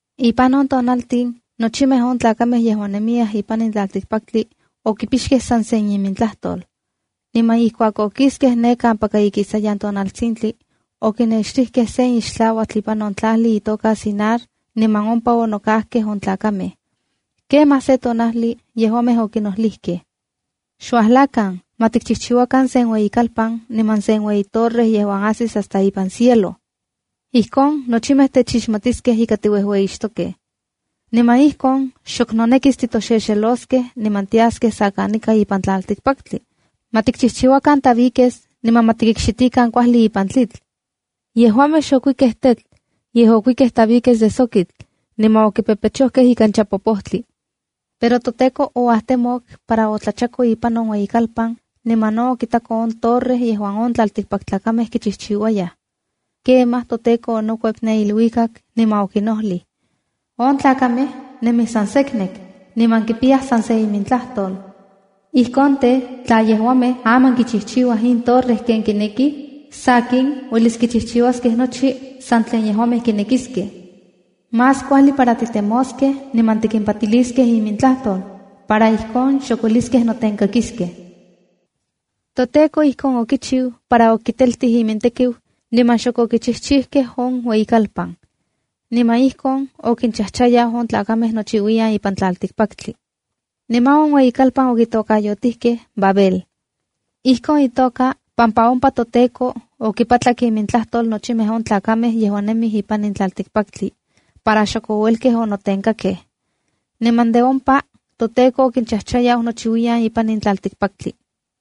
Ipan on tiempo nochimej on tlakamej yejuan nemiyaj ipan in tlaltikpaktli okipixkej san sen imintlajtol. Niman ijkuak okiskej ne kampaka ikisayan tonaltsintli, okinextijkej sen ixtlauatl ipan on tlajli itoka Sinar, niman ompa onokajkej on tlakamej. Kemaj se tonajli yejuamej okinojlijkej: “Xuajlakan, ma tikchijchiuakan sen ueyikalpan niman sen ueyi torre yejuan ajsis hasta ipan cielo. Ijkon nochimej techixmatiskej ika tiueyixtokej. Niman ijkon xok nonekis titoxexeloskej niman tiaskej sa kanika ipan tlaltikpaktli. Ma tikchijchiuakan tabiques niman ma tikikxitikan kuajli ipan tlitl.” (Yejuamej xokuikej tetl, yej okuikej tabiques de sokitl. Niman okipepechojkej ikan chapopojtli.) Pero toTEKO ouajtemok para otlachako ipan on ueyikalpan, niman no okitako on torre yejuan on tlaltikpaktlakamej kichijchiuayaj. Kemaj toTEKO onokuep ne iluilkak niman okinojlij: “On tlakamej nemij san seknek, niman kipiyaj san sen imintlajtol. Ijkon tej, tla yejuamej aman kichijchiuaj in torre ken kinekij, sakin uelis kichijchiuaskej nochi san tlen yejuamej kinekiskej. Más kuajli para titemoskej niman tikimpatiliskej imintlajtol para ijkon xok ueliskej notenkakiskej.” ToTEKO ijkon okichiu para okiteltij imintekiu niman xok okichijchijkej on ueyikalpan. Niman ijkon okinchajchayau on tlakamej nochiuiyan ipan tlaltikpaktli. Niman on ueyikalpan okitokayotijkej Babela Ijkon itoka pampa ompa toTEKO okipatlak imintlajtol nochimej on tlakamej yejuan nemij ipan in tlaltikpaktli para xok ouelkej onotenkakkej. Niman de ompa, toTEKO okinchajchayau nochiuiyan ipan tlaltikpaktli.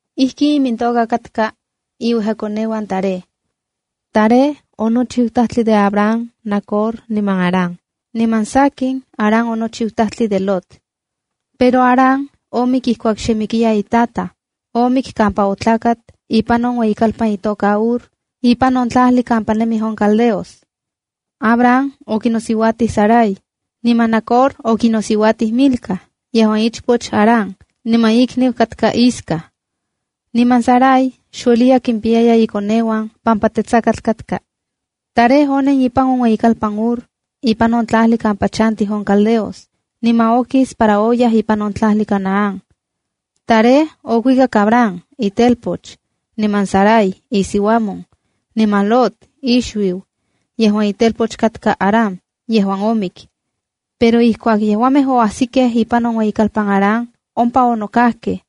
Ijkin imintoka katkaj inuejkakoneuan Taré. Taré onochiu tajtli de Abram, Nacor niman Harán. Niman sakin, Harán onochiu tajtli de Lot. Pero Harán omik ijkuak xe mikiya itataj. Omik kampa otlakat, ipan on ueyikalpan itoka Ur ipan on tlajli kampa nemij on Caldeos. Abram okinosiuatij Sarai, niman Nacor okinosiuatij Milca, yejuan ichpoch Harán niman ikniu katka Isca. Niman Sarai xueliya kimpiyaya ikoneuan pampa tetsakatl katka. Taré onen ipan on ueyikalpan Ur ipan on tlajli kampa chantij on Caldeos, niman okis para oyaj ipan on tlajli Canaán. Taré okuikak Abram, itelpoch, niman Sarai, isiuamon, niman Lot, ixuiu, yejuan itelpoch katka Harán yejuan omik. Pero ijkuak yejuamej oajsikej ipan on ueyikalpan Harán, ompa onokajkej.